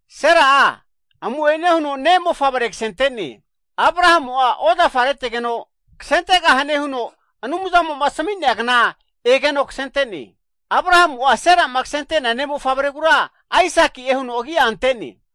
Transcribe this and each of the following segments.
Sera'a amu'ene huno ne' mofavre ksente'ne, Abrahamu ozafa retegeno ksentegahane huno Anumzamo asmi'nea kna egeno ksente'ne. Abrahamu ne'mofavre, Sera'ma ksentea mofavre'a Aisaki'e huno agi'a ante'ne.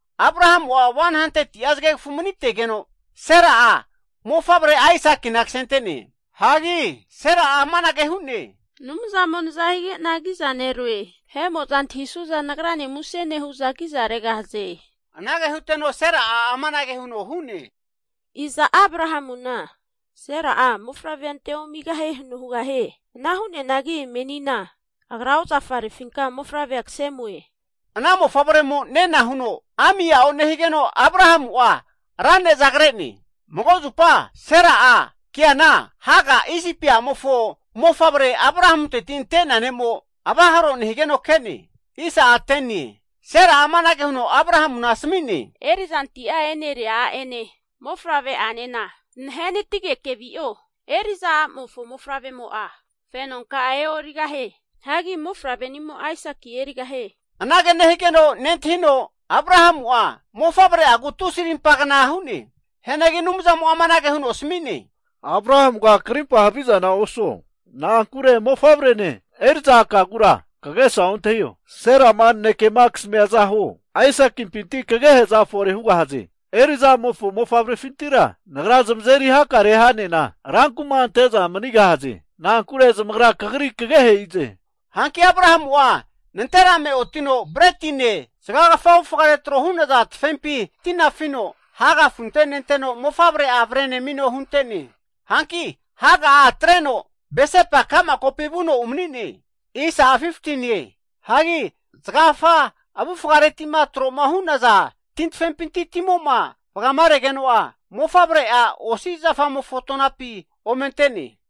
Abrahamu'a 100ti'a zgegfu mani'tegeno mofavre Aisakina Sera kasentene. Sera'a amanage hu'ne, Anumzamo naza hige'na kizaneroe. Vahe'mo'za antahisuza nagrane kiza regahaze. Anage huteno Sera'a amanage huno hu'ne, Iza Abrahamuna, Sera'a mofavre'a ante omigahie huno hugahie? Ana hu'neanagi menina agra ozafarefinka mofavre kse amue. Ana Mofavremo nena huno ami a'o nehigeno Abrahamu'a ra ne'za kre'ne. Mago zupa Sera'a keana Hega, Isipi a'mofo mofavre, Abrahamunteti ante'nea nemo avaharo nehigeno ke'ne. Sera'a amanage huno Abrahamu asmi'ne, Erizanti'a e'neria a'ene mofavre'anena zanahenatige'ne vio, eri'za a'mofo mofavremo'a fenonka'a e'origahie, mofavre'nimo Aisaki erigahie. Anage nehigeno nentahino, Abrahamu'a mofavre'agu tusi rimpagna hu'ne. Hianagi Anumzamo asami'ne, Abrahamuga krimpa haviza osuo, na'ankure mofavrene eri'za a' kagura kagesa ontahio, Sera'ma naneke kasmiaza huo, Aisaki'pinti kagehe'za fore hugahaze. Eriza a'mofo mofavrefintira Nagra zamazeri hakare ha'nena rankuma ante'za manigahaze. Na'ankure zamagra kagri kageheze. Hanki Abrahamu nanterame otino bretine, zgakfa avufgare tafempi tifino Hega afunte nenteno mofavre'a amino hunte'ne. Hanki Hega atreno Birseba ka'ma kopi vu'no umani'ne. Anampi zgagfa avufgare tafempi ti afine vuna'a timo vgaregeno, mofavre'a osi zafa agafare ome ante'ne.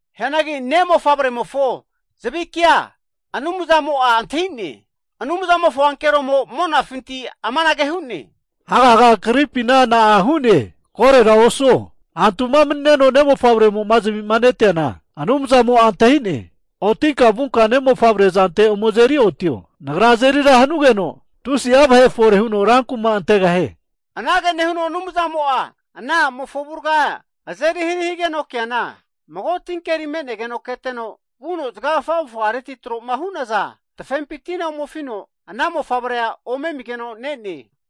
Hianagi Anumzamo antahi'ne, ne' mofavremofo zavike'a, Anumzamofo ankeromo monafinti amanage hu'ne, Hegaga kagripina na'a hu'ne? Koro osuo, antufi mani'neno ne'mofavremo zavima neteana Anumzamo antahi'ne. Otinenka ne'mofavre azante azeri otinka avro, Nagra azeri ra hanugeno tusi'a vahe fore huno rankuma antegahie. Anumzamo ana a'mofo avurga azeri hari higeno keana mago tinkeri me'negeno ke'ne. Keteno vuno zgagfa avufgare tafempi ti afino ana mofavre ome amigeno ne'ne.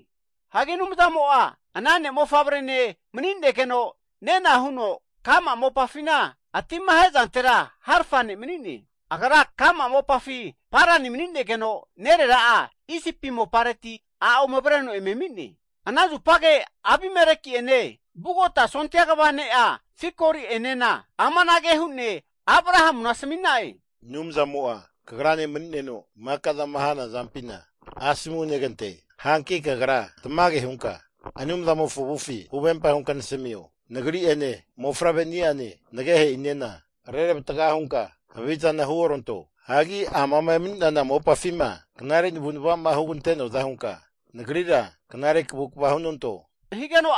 Anumzamo ana ne'mofavrene mani'negeno nena huno, ka'ma mopafi ati ahe'zante harfa ne mani'ne. Agra ka'ma mopafi Parani mani'negeno, nerera'a Isipi mopareti a' ome avreno eme ami'ne. Ana zupage Abimeleki'ene vugota ha' kva ne'a Fikoli'ene amanage hu'ne Abrahamuna asmina'e, Anumzamo kagrane mani'neno maka'za hanazampina kzeri knare nehie. Hanki kagra amafina tmage hunka Anumzamofo avufi huvempa hunka nasmio. Nagri ene, mofavreniane, nagehe'inena reravatga hunka haviza huoranto, knare navunva hugante'noaza hunka nagrira knare kvukva hunanto, amama emani'nana mopafina.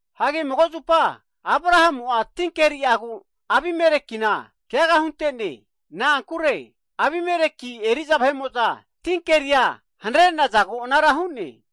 Ana hianagi Abrahamu'a tinkeriagu Abimelekina keaga hunte'ne, na'ankure Abimeleki eri'za vahe'mo'za tinkeria hanare'nazagu hu'ne.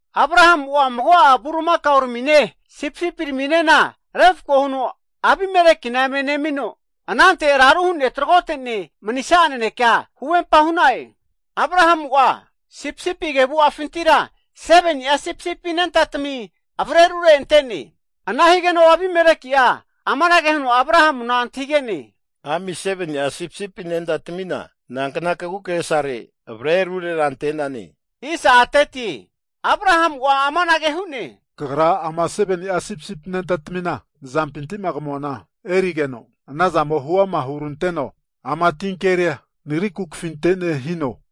Abrahamu'a mago'a eri'za eri kaoma (oksen), sipisipima refko huno Abimelekina eme nemino, anante raru hu'ne tragote'ne manisa'a naneke huvempa (covenant) hu'na'e. Abrahamu 7ni'a sipisipi a' anenta avreno arure ante'ne. Abimeleki amanage huno Abrahamu antahige'ne, ami 7ni'a a' sipisipi anentara nankna kagukagesare avre ruotge hu'nane? Abrahamu amanage hu'ne, kagra ama 7ni'a a' sipisipi anentara nazapinti kamuana erigeno, anazamo hu'ama huranteno ama tinkeri nagra kafinoe hino.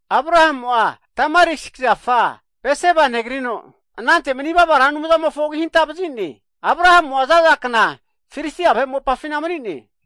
Abrahamu tamarisk zafa Bersiba negrino, anante manivava Anumzante Ra Anumzamofo agi hanta vazine. Abrahamu'a zaza kna Filistia vahe mopare mani'ne.